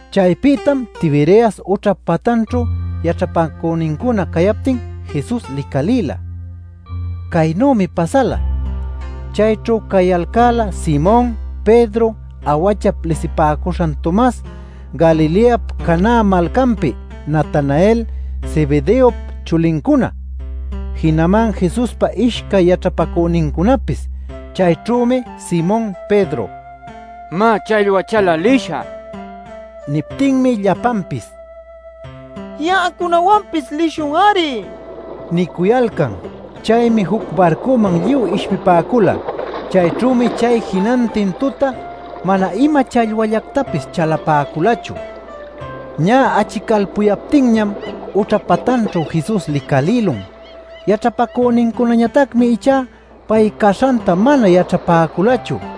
Chaypïtam Tiberias ućhap patanćhu yaćhapacünincuna cayaptin Jesus licalïla. Caynümi pasala. Chayćhu cayalcäla Simon Pedro, “Awachap” lisipäcuśhan Tomas, Galileap Caná malcanpi Natanael, Zebedeop chulincuna, jinaman Jesuspa ishcay yaćhapacünincunapis. Chayćhümi Simon Pedro: “Má, challwa chalä lishä” nin. Niptinmi llapanpis: “Ya'acunawanpis lishun-ari” nicuyalcan. Chaymi juc barcuman lluy ishpipäcula. Chayćhümi chay jinantin tuta mana ima challwallactapis chalapäculachu. Ñä achicalpuyaptinñam ućha patanćhu Jesus licalïlun. Yaćhapacünincunañatacmi ichá pay caśhanta mana yaćhapäculachu.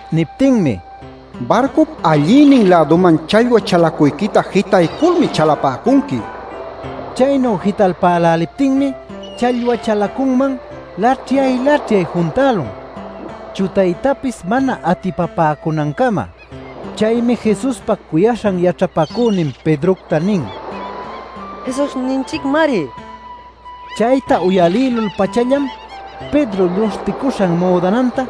Niptinmi: “Barcup allïnin-läduman challwa chalacuyquita jitayculmi chalapäcunqui” nin. Chaynu jitalpäläliptinmi challwa chalacunman laćhyay-laćhyay juntälun chutaytapis mana atipapäcunancama. Chaymi Jesuspa cuyaśhan yaćhapacünin Pedrocta nin: “¡Jesusninchicmari!” nil. Chayta uyalïlul-pachallam Pedro lluśhticüśhan müdananta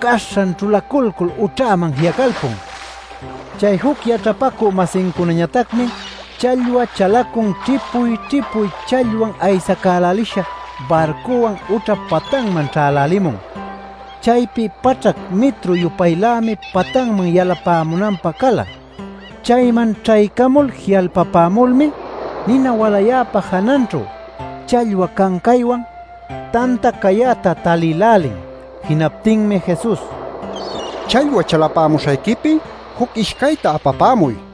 caśhan ćhulaculcul ućhäman ji'acalpun. Chay juc yaćhapacü-masincunañatacmi challwa chalacun ćhipuy-ćhipuy challwan aysacälälisha barcuwan ućhap patanman ćhälälimun. Chaypi paćhac mitru-yupaylämi patanman yalapämunanpä cala. Chayman ćhaycamul ji'alpapämulmi nina walayäpa jananćhu challwa cancaywan, tanta cayäta talïlälin. Jinaptinmi Jesus: “Challwa chalapämuśhayquipi juc ishcayta apapämuy” nin.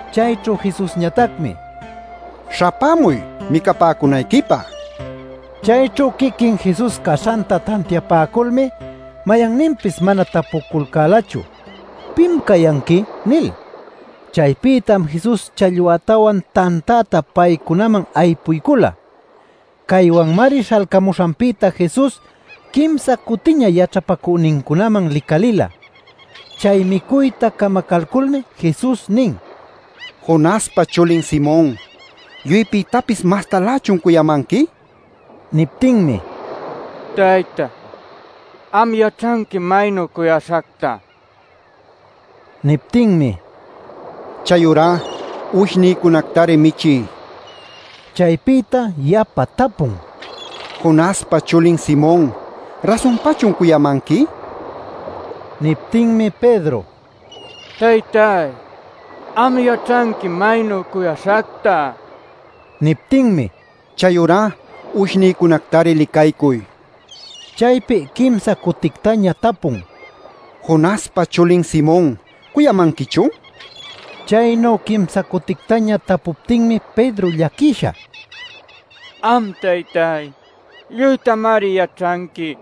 Chayćhu Jesusñatacmi: “Śhapämuy micapäcunayquipä” nin. Chayćhu quiquin Jesus caśhanta tantiapäculmi mayanninpis mana tapućhaculcälachu “¿Pim cayanqui?” nil. Chaypïtam Jesus challwätawan tantäta paycunaman aypuycula. Caywanmari śhalcamuśhanpïta Jesus quimsa cutiña yaćhapacünincunaman licalïla. Chay micuyta camacalculmi Jesus nin: “Jonaspa chulin Simon, ¿lluypïtapis mastalächun cuyamanqui?” nil. Niptinmi: “Taytay, am yaćhanquim maynu cuyaśhacta” nin. Niptinmi: “Chayurá uwishnïcunactari michiy” nin. Chaypïta yapa tapun: “Jonaspa chulin Simon, ¿rasunpachun cuyamanqui?” nil. Niptinmi Pedro: “Taytay, am yaćhanquim maynu cuyaśhacta” nin. Niptinmi: “Chayurá uwishnïcunactari licaycuy” nin. Chaypi quimsa cutictaña tapun: “¿Jonaspa chulin Simon, cuyamanquichun?” nil. Chaynu quimsa cutictaña tapuptinmi Pedro llaquisha: “Am taytay, lluytamari yaćhanqui;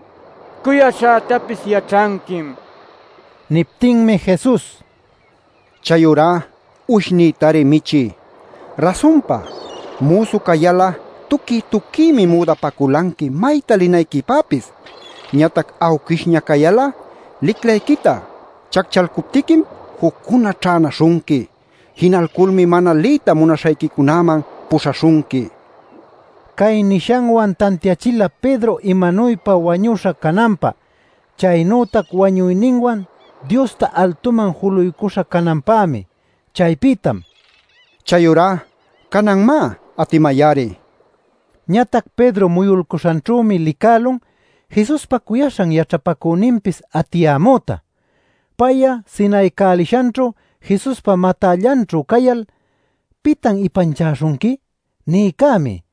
cuyaśhätapis yaćhanquim” nin. Niptinmi Jesus: “Chayurá uwishnïtari michiy. Rasunpa, müsu cayal'a tuquiy-tuquiymi müdapaculanqui mayta linayquipäpis. Ñatac awquishña cayal'a liclayquita chacchalcuptiquim, juccuna ćhänaśhunqui. Jinalculmi mana liyta munaśhayquicunäman puśhaśhunqui” nin. Cay nishanwan tantiachila Pedro imanuypa wañuśha cananpä, chaynütac wañuyninwan Diosta altuman juluycuśha cananpämi. Chaypïtam “Chayurá canan, má, atimay-ari” nin Ñatac Pedro muyulcuśhanćhümi licälun Jesuspa cuyaśhan yaćhapacüninpis atiyämüta. (Pay'a sinaycälishanćhu Jesuspa matällanćhu cayal “¿Pitan ipanchäśhunqui?” nïcämi.)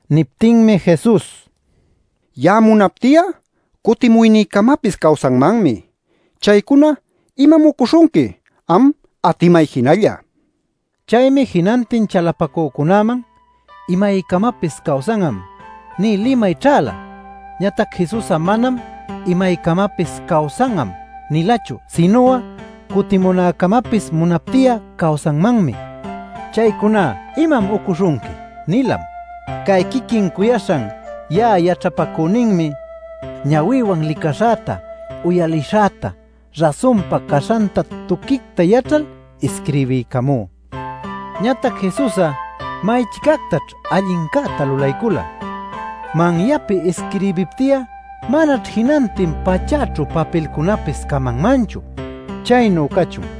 Niptinmi Jesus: “Ya'a munapti'a cutimuynïcamapis cawsanmanmi. Chaycuna ¿imam ucuśhunqui? Am atimay jinalla” nin. Chaymi jinantin chalapacücunäman “Imaycamapis cawsan'am” nï limay ćhäla. Ñatac Jesus'a manam “Imaycamapis cawsan'am” nilachu, sinu'a “Cutimunäcamapis munapti'a cawsanmanmi. Chaycuna ¿imam ucuśhunqui?” nilam. Cay quiquin cuyaśhan ya'a yaćhapacüninmi, ñawïwan licaśhäta, uyalishäta rasunpa caśhanta tuquicta yaćhal isquirbiycamú. Ñatac Jesus'a may-chicactaćh allincäta lulaycula. Manyapi isquirbipti'a manaćh jinantin pachäćhu papilcunäpis camanmanchu. Chaynu cachun.